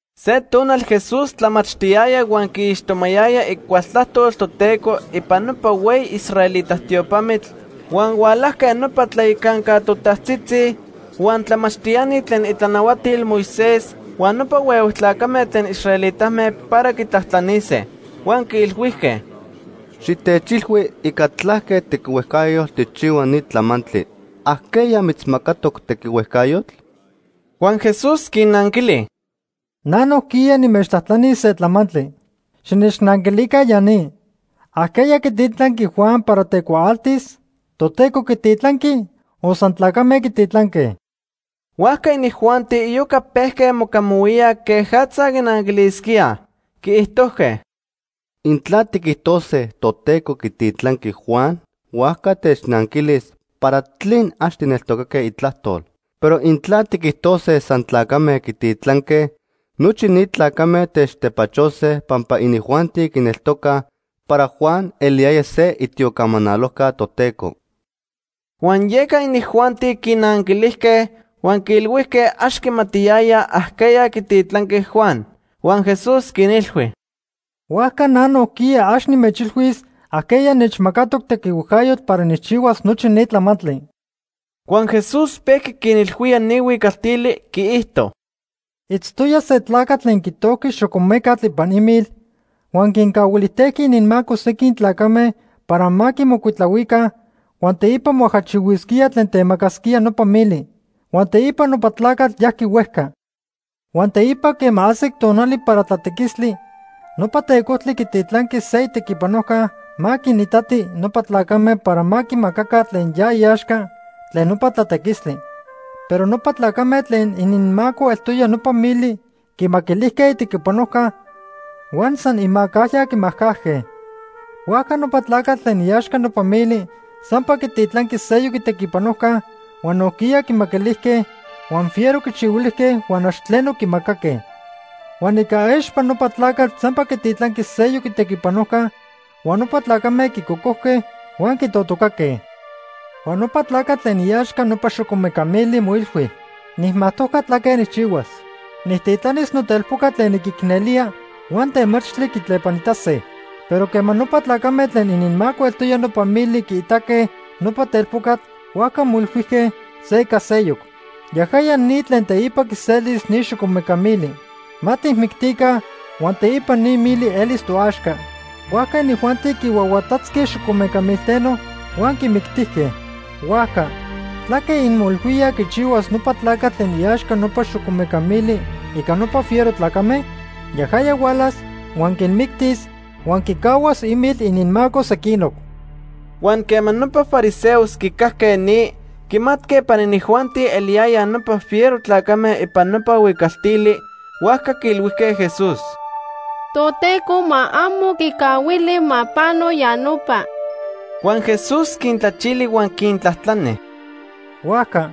Se tonal Jesús tlamachtiyaya huan quiixtomayaya icual tlajtol Toteco ipan nopa hueyi israelita tiopamitl, huan hualajque nopa tlayacanca totajtzitzi, huan tlamachtiani tlen itlanahuatil Moisés huan nopa huehue tlacame tlen israelitame para quitlajtlanise. Huan quiilhuijque: ―Xitechilhui ica tlaque tequihuejcayotl tijchihua ni tlamantli. ¿Ajqueya mitzmacatoc tequihuejcayotl? Huan Jesús quinnanquili: ―Na nojquiya nimechtlajtlanis se tlamantli. Xinechnanquilica ya ni. ¿Ajqueya quititlanqui Juan para tecuaaltis? ¿Toteco quititlanqui o san tlacame quititlanque? Huajca inijuanti iyoca pejque mocamahuíaj quejatza quinanquilisquíaj. Quiijtojque: “Intla tiquijtose Toteco quititlanqui Juan, huajca technanquilis ¿para tlen ax tijneltocaque itlajtol? Pero intla tiquijtose san tlacame quititlanque, nochi ni tlacame techtepachose pampa inijuanti quineltocaj para Juan eliyaya se itiocamanalojca Toteco.” Huan yeca inijuanti quinanquilijque, huan quiilhuijque ax quimatiyayaj ajqueya quititlanqui Juan. Huan Jesús quinilhui: ―Huajca na nojquiya ax nimechilhuis ajqueya nechmacatoc tequihuejcayotl para nijchihuas nochi ni tlamantli. Huan Jesús pejqui quinilhuía ni huicaltili, quiijto: “Itztoya se tlacatl tlen quitojqui xocomecatl ipan imil huan quincahuilijtejqui ininmaco sequin tlacame para ma quimocuitlahuica huan teipa moajachihuisquíaj tlen temacasquía nopa mili. Huan teipa nopa tlacatl yajqui huejca. Huan teipa quema ajsic tonali para tlatequistli, nopa tecojtli quititlanqui se itequipanojca ma quinitati nopa tlacame para ma quimacaca tlen ya iaxca tlen nopa tlatequistli. Pero nopa tlacame tlen ininmaco eltoya nopa mili quimaquilijque itequipanojca huan san imacajya quimacajque. Huajca nopa tlacatl tlen iaxca nopa mili sampa quititlanqui seyoc itequipanojca, huan nojquiya quimaquilijque, huan fiero quichihuilijque huan ax tleno quimacaque. Huan ica expa nopa tlacatl sampa quititlanqui seyoc itequipanojca, huan nopa tlacame quicocojque huan quitotocaque. “Huan nopa tlacatl tlen iaxca nopa xocomeca mili moilhui: ‘Nijmajtojca tlaque nijchihuas. Nijtitlanis notelpoca tlen niquicnelía huan temachtli quitlepanitase.’ Pero quema nopa tlacame tlen ininmaco eltoya nopa mili quiitaque nopa telpocatl, huajca moilhuijque se ica seyoc: ‘Yajaya ni tlen teipa quiselis ni xocomeca mili. Ma tijmictica huan teipa ni mili elis toaxca.’ Huajca inijuanti quihuahuatatzque xocomeca milteno huan quimictijque. “Huajca ¿tlaque inmoilhuíaj quichihuas nopa tlacatl tlen iaxca nopa xocomeca mili ica nopa fiero tlacame? Yajaya hualas huan quinmictis huan quicahuas imil ininmaco sequinoc.” Huan quema nopa fariseos quicajque ni, quimatque para inijuanti eliyayaj nopa fiero tlacame ipan nopa huicaltili, huajca quiilhuijque Jesús: ―¡Toteco ma amo quicahuili ma pano ya nopa! Huan Jesús quintlachili huan quintlajtlani: ―Huajca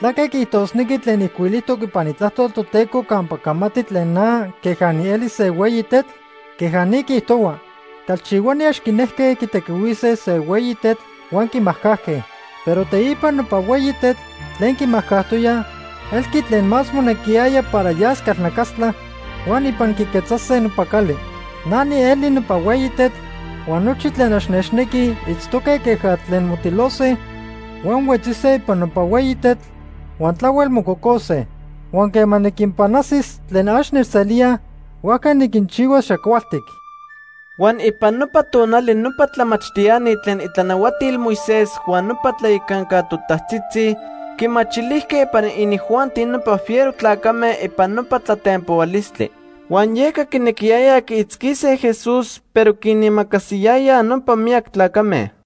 ¿tlaque quiijtosnequi tlen ijcuilijtoc ipan Itlajtol Toteco campa camati tlen na queja nieli se hueyi tetl? Queja ni quiijtohua: ‘Calchihuani ax quinejque quitequihuise se hueyi tetl, huan quimajcajque. Pero teipa nopa hueyi tetl tlen quimajcajtoyaj, elqui tlen más monequiyaya para yas calnacastla huan ipan quiquetzase nopa cali.’ Na nieli nopa hueyi tetl huan nochi tlen ax nechnequij itztoque queja tlen motilose huan huetzise ipan nopa hueyi tetl, huan tlahuel mococose. Huan quema niquinpanajsis tlen ax nechselíaj, huajca niquinchihuas xacualtic. Huan ipan nopa tonali nopa tlamachtiani tlen itlanahuatil Moisés huan nopa tlayacanca totajtzitzi quimachilijque para inijuanti nopa fiero tlacame ipan nopa tlatenpohualistli. Huan yeca quinequiyayaj quiitzquise Jesús, pero quinimacasiyayaj nopa miyac tlacame.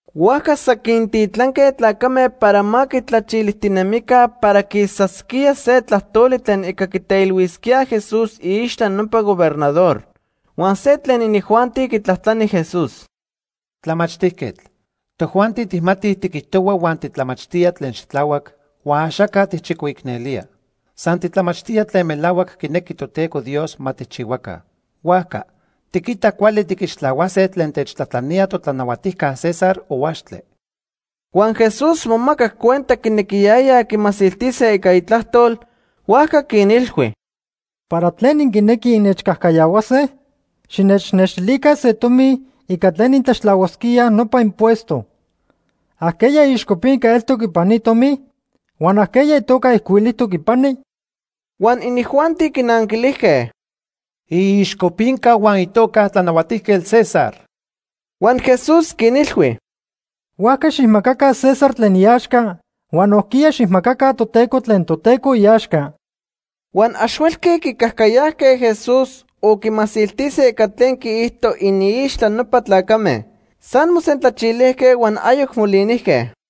Huajca san quintitlanque tlacame para ma quitlachilijtinemica para quicaquisquíaj se tlajtoli tlen ica quiteilhuisquíaj Jesús iixtla nopa gobernador. Huan se tlen inijuanti quitlajtlani Jesús: ―Tlamachtijquetl, tojuanti tijmatij tiquijtohua huan titlamachtía tlen xitlahuac huan axaca tijchicoicnelía. San titlamachtía tlen melahuac quinequi Toteco Dios ma tijchihuaca. Huajca ¿tiquita cuali tiquixtlahuase tlen techtlajtlanía totlanahuatijca César o axtle? Huan Jesús momacac cuenta quinequiyayaj quimasiltise ica itlajtol, huajca quinilhui: ―¿Para tlen inquinequij innechcajcayahuase? Xinechnextilica se tomi ica tlen intlaxtlahuasquíaj nopa impuesto. ¿Ajqueya iixcopinca eltoc ipan ni tomi? Huan ¿ajqueya itoca ijcuilijtoc ipani? Huan inijuanti quinanquilijque: ―Iixcopinca huan itoca Tlanahuatijquetl César. Huan Jesús quinilhui: ―Huajca xijmacaca César tlen iaxca huan nojquiya xijmacaca Toteco tlen Toteco iaxca. Huan ax huelque quicajcayajque Jesús o quimasiltise ica tlen quiijto iniixtla nopa tlacame. San mosentlachilijque, huan ayoc molinijque.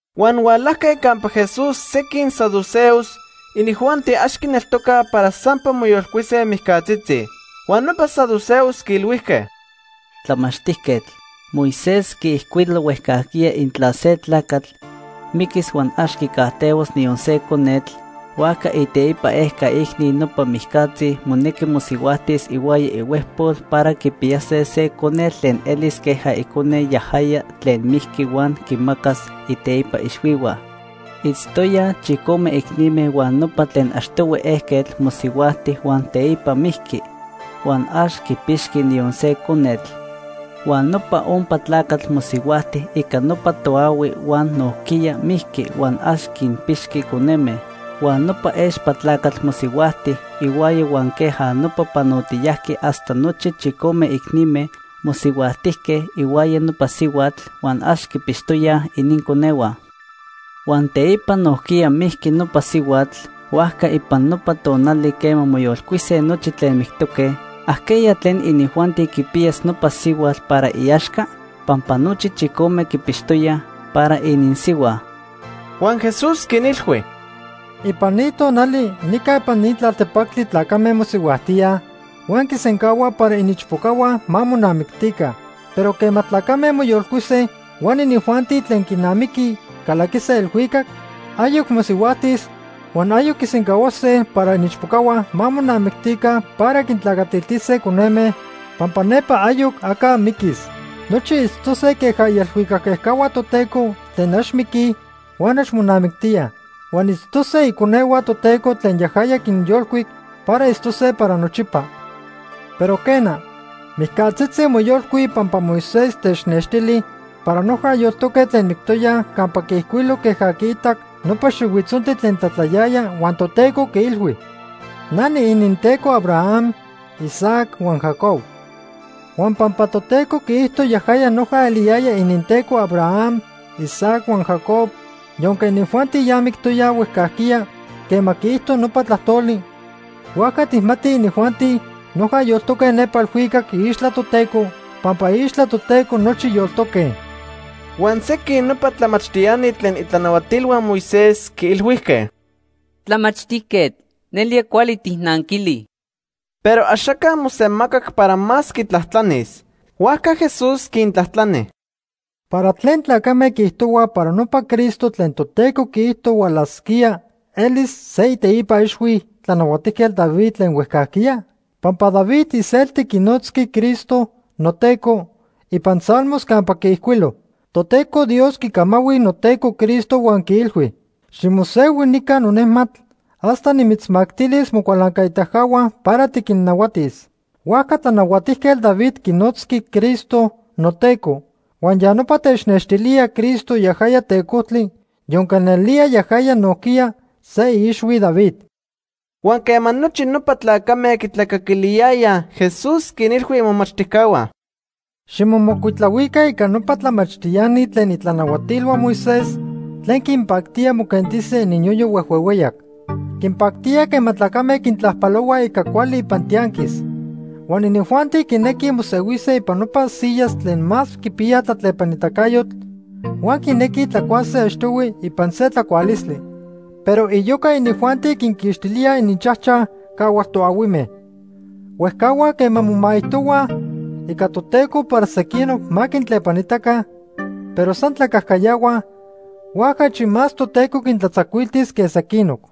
Huan hualajque campa Jesús sequin saduceos. Inijuanti ax quineltocaj para sampa moyolcuise mijcatzitzi. Huan nopa saduceos quiilhuijque: ―Tlamachtijquetl, Moisés quiijcuilo huejcajquiya intla se tlacatl miquis huan ax quicajtehuas niyon se conetl, huajca iteipa ejca icni nopa mijcatzi monequi mosihuajtis ihuaya ihuejpol para quipiyase se conetl tlen elis queja icone yajaya tlen mijqui huan quimacas iteipa ixhuihua. Itztoyaj chicome icnime huan nopa tlen achtohui ejquetl mosihuajti huan teipa mijqui, huan ax quipixqui niyon se conetl. Huan nopa ompa tlacatl mosihuajti ica nopa toahui huan nojquiya mijqui huan ax quinpixqui coneme. Huan nopa expa tlacatl mosihuajti ihuaya huan queja nopa panotiyajqui hasta nochi chicome icnime mosihuajtijque ihuaya nopa sihuatl huan ax quipixtoyaj ininconehua. Huan teipa nojquiya mijqui nopa sihuatl. Huajca ipan nopa tonali quema moyolcuise nochi tlen mictoque, ¿ajqueya tlen inijuanti quipiyas nopa sihuatl para iaxca? pampa nochi chicome quipixtoyaj para ininsihua. Huan Jesús quinilhui: ―Ipan ni tonali nica ipan ni tlaltepactli tlacame mosihuajtíaj, huan quisencahuaj para iniichpocahua ma monamictica. Pero quema tlacame moyolcuise huan inijuanti tlen quinamiqui calaquise elhuicac, ayoc mosihuajtis huan ayoc quisencahuase para iniichpocahua ma monamictica para quintlacatiltise coneme, pampa nepa ayoc aca miquis. Nochi itztose queja ielhuicac ejcahua Toteco, tlen ax miquij huan ax monamictíaj. Huan itztose iconehua Toteco tlen yajaya quinyolcuic para itztose para nochipa. Pero quena, mijcatzitzi moyolcuij pampa Moisés technextili para noja yoltoque tlen mictoyaj campa quiijcuilo queja quiitac nopa xihuitzontli tlen tlatlayaya huan Toteco quiilhui: ‘Na niininteco Abraham, Isaac huan Jacob.’ Huan pampa Toteco quiijto yajaya noja eliyaya ininTeco Abraham, Isaac huan Jacob yonque inijuanti ya mictoyaj huejcajquiya quema quiijto nopa tlajtoli, huajca tijmatij inijuanti noja yoltoque nepa elhuicac iixtla Toteco, pampa iixtla Toteco nochi yoltoque. Huan sequin nopa tlamachtiani tlen itlanahuatilhua Moisés quiilhuijque: ―Tlamachtijquetl, nelía cuali tijnanquili. Pero axaca mosemacac para más quitlajtlanis. Huajca Jesús quintlajtlani: ―¿Para tlen tlacame quiijtohuaj para nopa Cristo tlen Toteco quiijto hualasquía elis se iteipa ixhui Tlanahuatijquetl David tlen huejcajquiya? Pampa David iselti quinotzqui Cristo ‘noTeco’ ipan Salmos campa quiijcuilo: ‘Toteco Dios quicamahui noTeco Cristo huan quiilhui: Ximosehui nica nonejmatl, hasta nimitzmactilis mocualancaitacahua para tiquinnahuatis.’ Huajca Tlanahuatijquetl David quinotzqui Cristo ‘noTeco’ huan ya nopa technextilía Cristo yajaya Tecojtli, yonque nelía yajaya nojquiya se iixhui David. Huan quema nochi nopa tlacame quitlacaquiliyayaj, Jesús quinilhui imomachtijcahua: “Ximomocuitlahuica ica nopa tlamachtiani tlen itlanahuatilhua Moisés tlen quinpactía moquentise ininyoyo huejhuehueyac. Quinpactía quema tlacame quintlajpalohuaj ica cuali ipan tianquis. Huan inijuanti quinequij mosehuise ipan nopa sillas tlen más quipiya tlatlepanitacayotl huan quinequij tlacuase achtohui ipan se tlacualistli. Pero iyoca inijuanti quinquixtilíaj ininchajchaj cahual toahuime. Huejcahuaj quema momaijtohuaj ica Toteco para sequinoc ma quintlepanitaca, pero san tlacajcayahuaj, huajca achi más Toteco quintlatzacuiltis que sequinoc.”